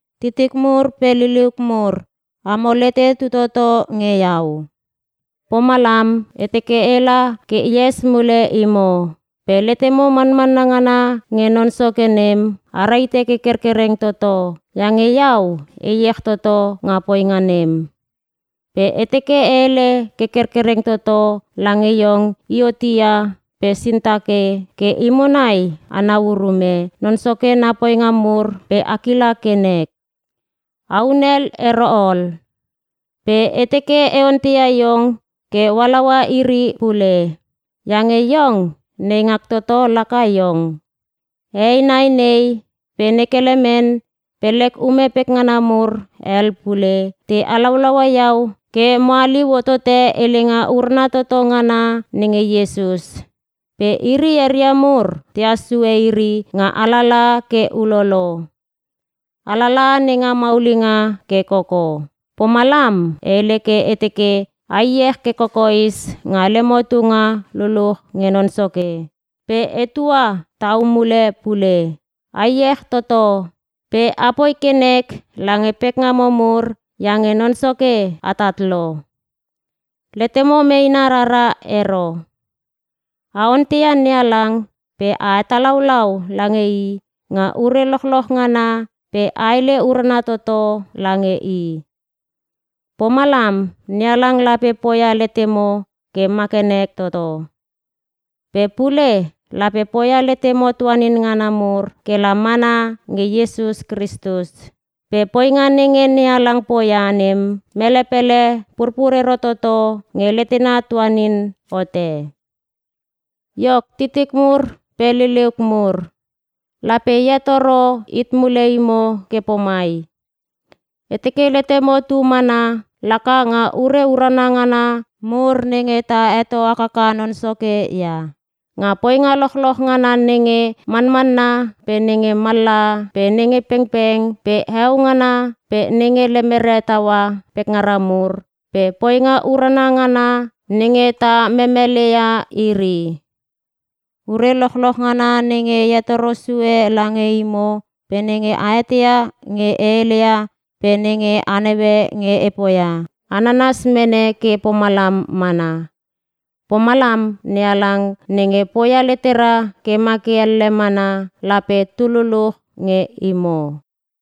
Titik mur pe liliuk mur, amo lete tu toto nge iau. Pomalam, e teke ela ke ees mule imo. Pe letemo manmanna ngana nge Non Soke nem, a rahite ke kerkereng toto, iange iau e iech toto nga poinga nem! Pe e teke e hele ke kerkereng toto lange iong Iuotia pe Sintike, ke imo nai anau urume Non Soke na poinga mur pe a kila ke nek. A hunel ero ol. Pe e teke e onteia iong ke o halaua iri pule. Iange iong, neingak toto laka iong. Hehei nai nei pe ne Kelemen pe lek ume pekngana mur hel pule, te halaulaua iau ke mo haliu hotote helenga urana toto ngana nenge Iesus. Pe iri eria mur tehas sue iri nga alalaha ke ulolo. Alalaha nenga maulinga ke koko. Pomalam e hele ke e teke a iech ke kokoes nga lemo tunga luluch nge Non Soke. Pe etua tau mule pule: A iech toto! Pe a poi ke nek lange pekngamo mur iange Non Soke atat lo. Letemo meena rara ero. A onteia NeHalang pe a hetalaualau lange I nga ure lochloch ngana pe a hele urana toto lange i. Pomalam, NeHalang lape poia letemo ke ma ke nek toto. Pe pule, lape poia letemo tuanin ngana mur ke la mana nge Iesus Kristus. Pe poinga nenge NeHalang poia nem, mele pele purpur ero toto nge letena tuanin hote. Iok titik mur pe liliuk mur, lape e hetoro hit mule imo ke pomai, e teke letemo tu mana laka nga ure urana ngana mur nenge ta heto hakaka Non Soke ia: Nga poinga lochloch ngana nenge manmanna pe nenge mallaha pe nenge pengpeng pe heo ngana pe nenge lemere taua pekngara mur pe poinga urana ngana nenge ta memeleia iri. Ure lochloch ngana nenge e hetoro sue lange imo pe nenge a eteia nge e hele ia pe nenge a naue nge e poia, a nanas mene ke pomalam mana. Pomalam NeHalang nenge poia letera ke ma ke elle mana, lape tu luluch nge imo.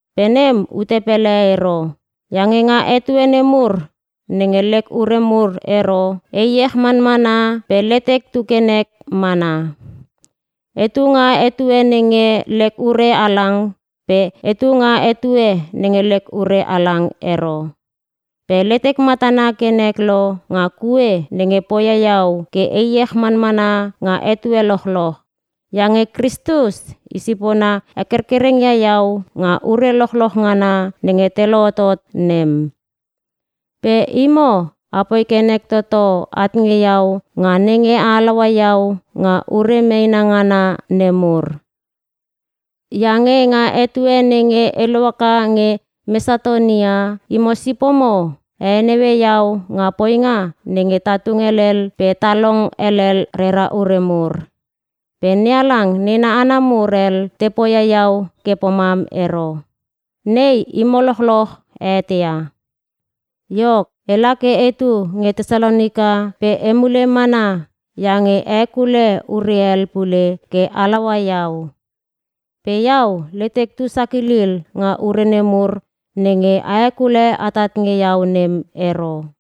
Pe nem ute pele ero. Iange nga etue nemur nenge lek ure mur ero, e iech manmana pe letek tu ke nek mana. Etu nga etue nenge lek ure halang pe etu nga etue nenge lek ure halang ero. Pe letek matana ke nek lo nga kue nenge poia iau ke e iech manmana nga etue lochloch. Iange Kristus i sipona hekerkereng ia iau nga ure lochloch ngana nenge te lohotot nem. Pe imo apoi ke nek toto at nge iau nga nenge a halaua iau nga ure meena ngana nemur. Iange nga etue nenge e lohaka nge Mesatonia, imo sipomo a heneue iau nga poinga nenge ta tung helel pe ta long helel rera ure mur. Pe NeHalang nena hana mur hel te poia iau ke pomam ero. Nei imo lochloch a eteia. Iok, ela ke etu nge Tesalonika pe emule mana a hekule ure hel pule ke halaua iau. Pe iau letek tu sakilil nga ure nemur nenge a hekule atat nge iau nem ero.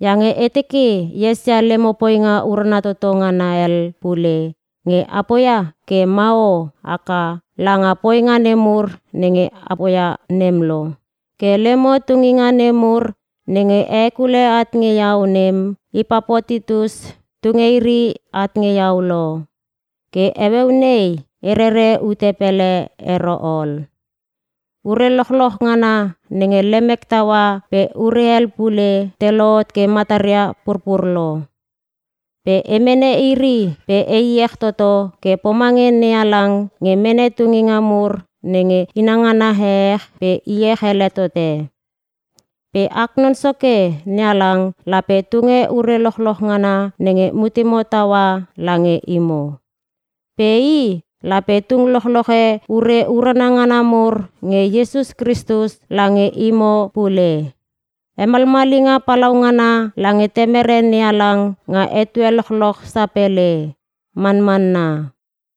Iange e teke e esia lemo poinga urana toto ngana hel pule, nge a poia ke mahoho haka langa poinga nemur nenge a poia nem lo. Ke lemo tunginga nemur nenge a hekule at nge iau nem, Ipapotitus tunge iri at nge iau lo. Ke heueu nei e rere ute pele ero ol. Ure lochloch ngana nenge lemek taua pe ure hel pule te lohot ke mataria purpur lo. Pe e mene iri pe e iech toto ke pomange NeHalang nge mene tunginga mur nenge inangana ehech pe iech ele tote. Pe ak Non Soke NeHalang lape tunge ure lochloch ngana nenge mutemo taua lange imo. Pe I lape tung lochloche ure urana ngana mur nge Iesus Kristus lange imo pule. Hemalmalinga palaungana lange Temere NeHalang nga etue lochloch sapele. Manmanna.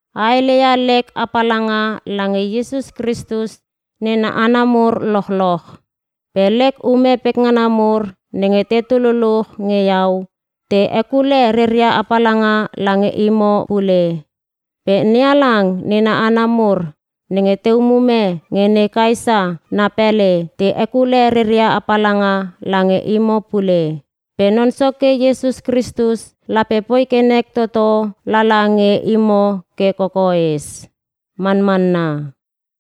A hele ia lek apalanga lange Iesus Kristus nena hana mur lochloch. Pe lek ume pekngana mur nenge tetu luluch nge iau, te hekule reria apalanga lange imo pule. Pe NeHalang nena hana mur nenge te umume nga ne Kaesa na pele, te hekule reria apalanga lange imo pule. Pe Non Soke Iesus Kristus lape poi ke nek toto lala nge imo ke kokoes. Manmanna.